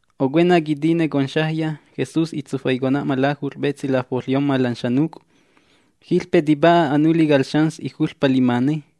Ocuena quitine conxajya, Jesús itsufaicona'ma lajut'ƚ petsi lafoƚyomma lan xanuc'. Jiƚpe tipa'a anuli cal xans ijuƚpa limane.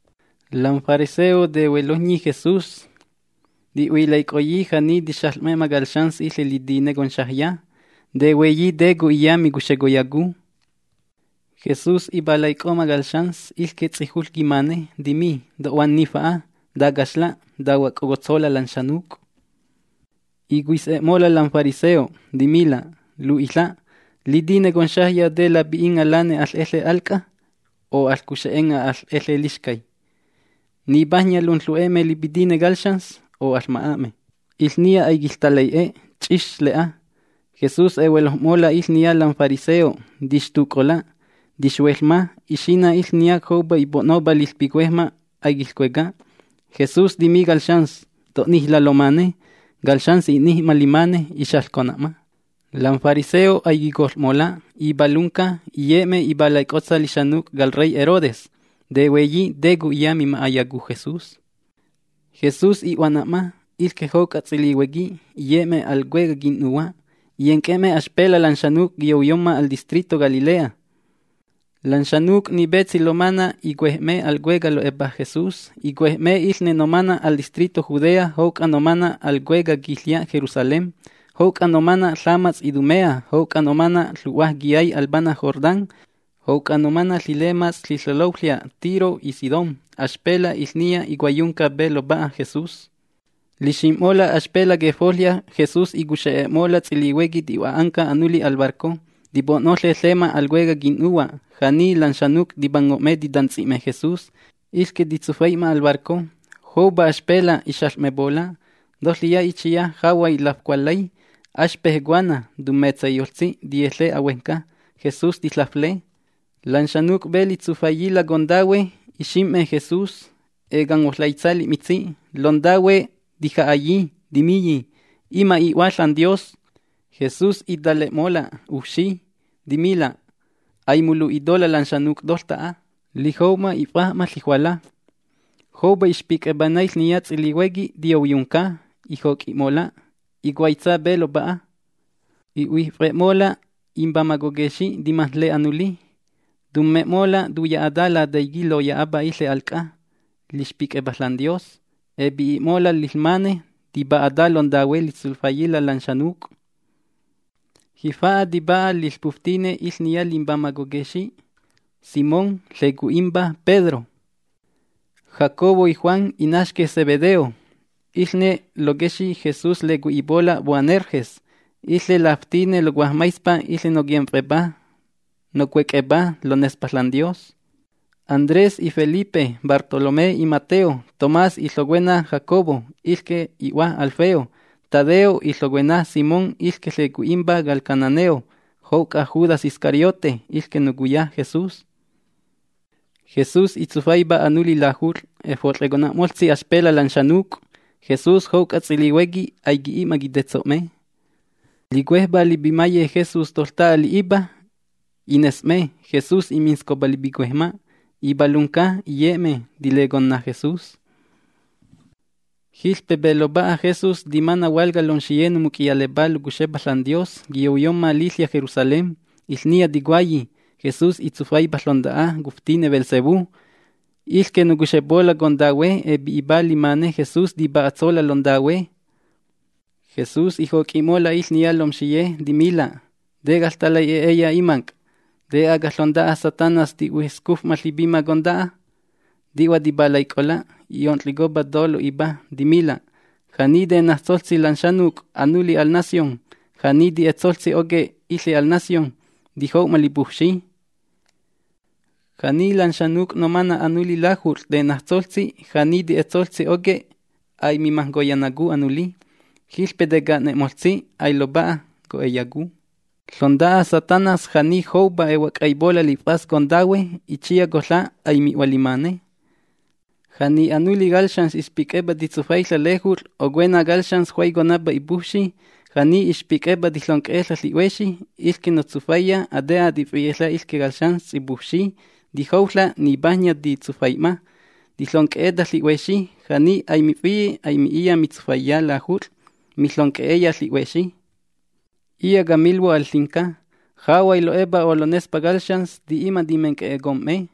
Lam fariseo tehuelojnyi Jesús. Ti'huilaic'oyi ja'ni tixaƚ'me'ma cal xans iƚe litine conxajya. Tehueyi te co'iya micuxecoyacu. Jesús ipalaic'o'ma cal xans, iƚque ts'ijuƚ quimane. Timi: ―To'huanni fa'a. Tacaxla', tahuoc'ocotsola' lan xanuc'. Icuis'e'mola' lam fariseo, timila': ―Lu'iƚa', litine conxajya, ¿te lapi'inga' lane aƚ'eƚe al c'a? O ¿aƚcuxe'enga' aƚ'eƚe lixcay? ¿Nipajnya lunƚu'e'me lipitine cal xans o aƚma'a'me? Iƚniya aiquiƚtalai'e. Ch'ix le'a. Jesús ehuelojm'mola' iƚne lam fariseo. Tixtuc'ola'. Tixhueƚma, ixina' iƚniya joupa ipo'nopá liƚpicuejma', aiquiƚcueca. Jesús timi cal xans: ―To'nijla' lomane. Cal xans i'nij'ma limane. Ixaƚcona'ma. Lam fariseo aiquicoƚ'mola', ipalunca, iye'me ipalaic'otsa lixanuc' cal rey Herodes. Tehueyi te co'iya mima'ayacu Jesús. Jesús i'huana'ma. Iƚque jouc'a ts'ilihuequi iye'me al cuecaj quin'nuhua'. Iyenc'e'me axpela' lan xanuc' quiyouyomma al distrito Galilea. Lan xanuc' ni petsi lomana' icuej'me al cueca' lo'epa Jesús. Icuej'me iƚne nomana' al distrito Judea jouc'a nomana' al cuecaj quiƚya' Jerusalén, jouc'a nomana' ƚamats' Idumea, jouc'a nomana' ƚu'hua quiyay al pana' Jordán, jouc'a nomana' ƚilemats' ƚiƚeloƚya' Tiro y Sidón. Axpela' iƚniya icuaiyunca pe lopa'a Jesús. Lixim'mola' axpela' quefoƚya Jesús icuxe'e'mola' ts'ilihuequi ti'hua'anca anuli al barco, tipo'noƚe ƚema al cuecaj quin'nuhua'. Ja'ni lan xanuc' tipango'me titantsi'me Jesús, iƚque titsufai'ma al barco. Joupa axpela' ixaƚ'mepola', toƚiya itsiya jahuay lafcualƚay, axpej cuana, tummetsaiyoƚtsi, tiyeƚe ahuejnca Jesús, tiƚafle. Lan xanuc' pe litsufaiyila' contahue, lixim'me Jesús, ecanghuoƚaitsa li'mitsi'. Lontahue tija'ayi, timiyi: ―Ima' i'Hua ȽanDios. Jesús itale'mola' ujfxi. Timila': ―Aimunlu'itola' lan xanuc' toƚta'a. Lijou'ma if'aj'ma ƚijuala. Joupa ixpic'epa naiƚniya ts'ilihuequi tiyouyunca. Ijoc'i'mola'. Icuaitsa pe lopa'a. I'huijf'e'mola' imbamaj coquexi' timajnle anuli. Tumme'mola' tuya'ata Lataiqui' loya'apa iƚe al c'a lixpic'epa ȽanDios. Epi'i'mola' liƚmane tipa'ata lontahue litsufaiyila' lan xanuc'. Jifa'a tipa'a liƚpuftine iƚniya limbamaj coquexi': Simón, ƚecui'impa Pedro, Jacobo y Juan, inaxque' Zebedeo. Iƚne loquexi' Jesús lecui'ipola' Boanerges. Iƚe laftine locuajmaispa: Iƚne noquimf'epá, nocuec'epá lonespa ȽanDios. Andrés y Felipe, Bartolomé y Mateo, Tomás y ƚocuena Jacobo, iƚque i'hua Alfeo, Tadeo y ƚocuena Simón, iƚque ƚecui'impa cal cananeo, jouc'a Judas Iscariote, iƚque nocuya Jesús. Jesús itsufaipa anuli lajut'ƚ. Efot'ƚecona'moƚtsi axpela' lan xanuc'. Jesús jouc'a ts'ilihuequi aiqui'i'ma quitetso'me. Licuejpá lipimaye Jesús toƚta'a li'ipa, ines'me: Jesús iminscopa lipicuejma'. Ipalunca, iye'me, tileconna Jesús. Jiƚpe pe lopa'a Jesús timana' hualca lomxiye nomuc'iyalepá locuxepa ȽanDios, quiyouyomma liƚya' Jerusalén. Iƚniya ticuayi: ―Jesús itsufaipa ƚonta'a cuftine Beelzebú. Iƚque nocuxepola' contahue epi'ipa limane Jesús tipa'atsola' lontahue. Jesús ijoc'i'mola' iƚniya lomxiye, timila': ―¿Te caƚtalai'e'eya imanc'? ¿Te aga ƚonta'a Satanás tihuescuf'ma ƚipima conta'a? Ti'hua tipalaic'ola'. I'onƚicopa to lo'ipa. Timila': ―Ja'ni tenajtsoƚtsi lan xanuc' anuli al nación, ja'ni ti'etsoƚtsi oque', iƚe al nación tijou'ma lipujfxi. Ja'ni lan xanuc' nomana' anuli lajut'ƚ tenajtsoƚtsi, ja'ni ti'etsoƚtsi oque', aimimajnconayacu anuli, jiƚpe teca'nena'moƚtsi, ailopa'a co'eyacu. Ƚonta'a Satanás ja'ni joupa ehuoc'huaipola' lif'as contahue, itsiya coƚa' aimi'hua limane. ’Ja'ni anuli cal xans ixpic'epa titsufaiƚa' lejut'ƚ ocuena cal xans juaiconapa ipujfxi, ja'ni ixpic'epa tiƚonc'e'eƚa' ƚi'huexi, iƚque notsufaiya, ate'a tifi'eƚa' iƚque cal xans ts'ipujfxi, tijouƚa' nipajnya titsufai'ma, tiƚonc'e'eta ƚi'huexi. Ja'ni aimifi'e, aimi'iya mitsufaiya lajut'ƚ, miƚonc'e'eya ƚi'huexi. ’Iya' camilhuo' al ƚinca: Jahuay lo'epa o lonespa cal xans, ti'i'ma timenc'e'ecom'me.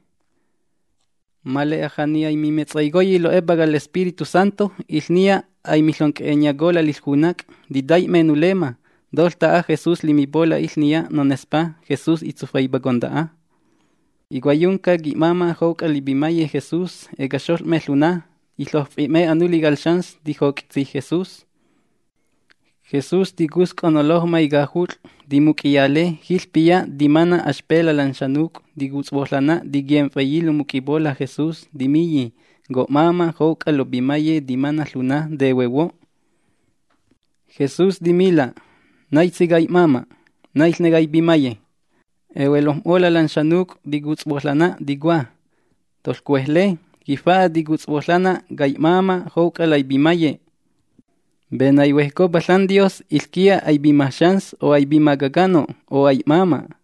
Ma le'a ja'ni aimimetsaicoyi lo'epa cal Espíritu Santo, iƚniya aimiƚonc'e'enyacola' liƚjunac'. Titai'me nulemma. Toƚta'a Jesús limipola' iƚniya nonespá: “Jesús itsufaipa conta'a”. Icuaiyunca qui'máma' jouc'a lipimaye Jesús. Ecaxoƚ'me ƚuna. Iƚojf'i'me anuli cal xans tijoc'itsi Jesús. Jesús ticusc'o nolojmay cajut'ƚ, timuc'iyale. Jiƚpiya timana' axpela' lan xanuc' ticutshuoƚanna tiquimf'eyi lomuc'ipola' Jesús. Timiyi: ―Co'máma' jouc'a lopimaye timana' ƚuna tehuehuo'. Jesús timila': ―¿Naitsi cai'máma'? ¿Naiƚne caipimaye? Ehuelojm'mola' lan xanuc' nocutshuoƚanna, ticua: ―¡Toƚcuejle! Jifa'a ticutshuoƚanna cai'máma' jouc'a laipimaye. Pe naihuejcopa ȽanDios, iƚquiya aipima xans, o aipima caca'no', o ai'máma'.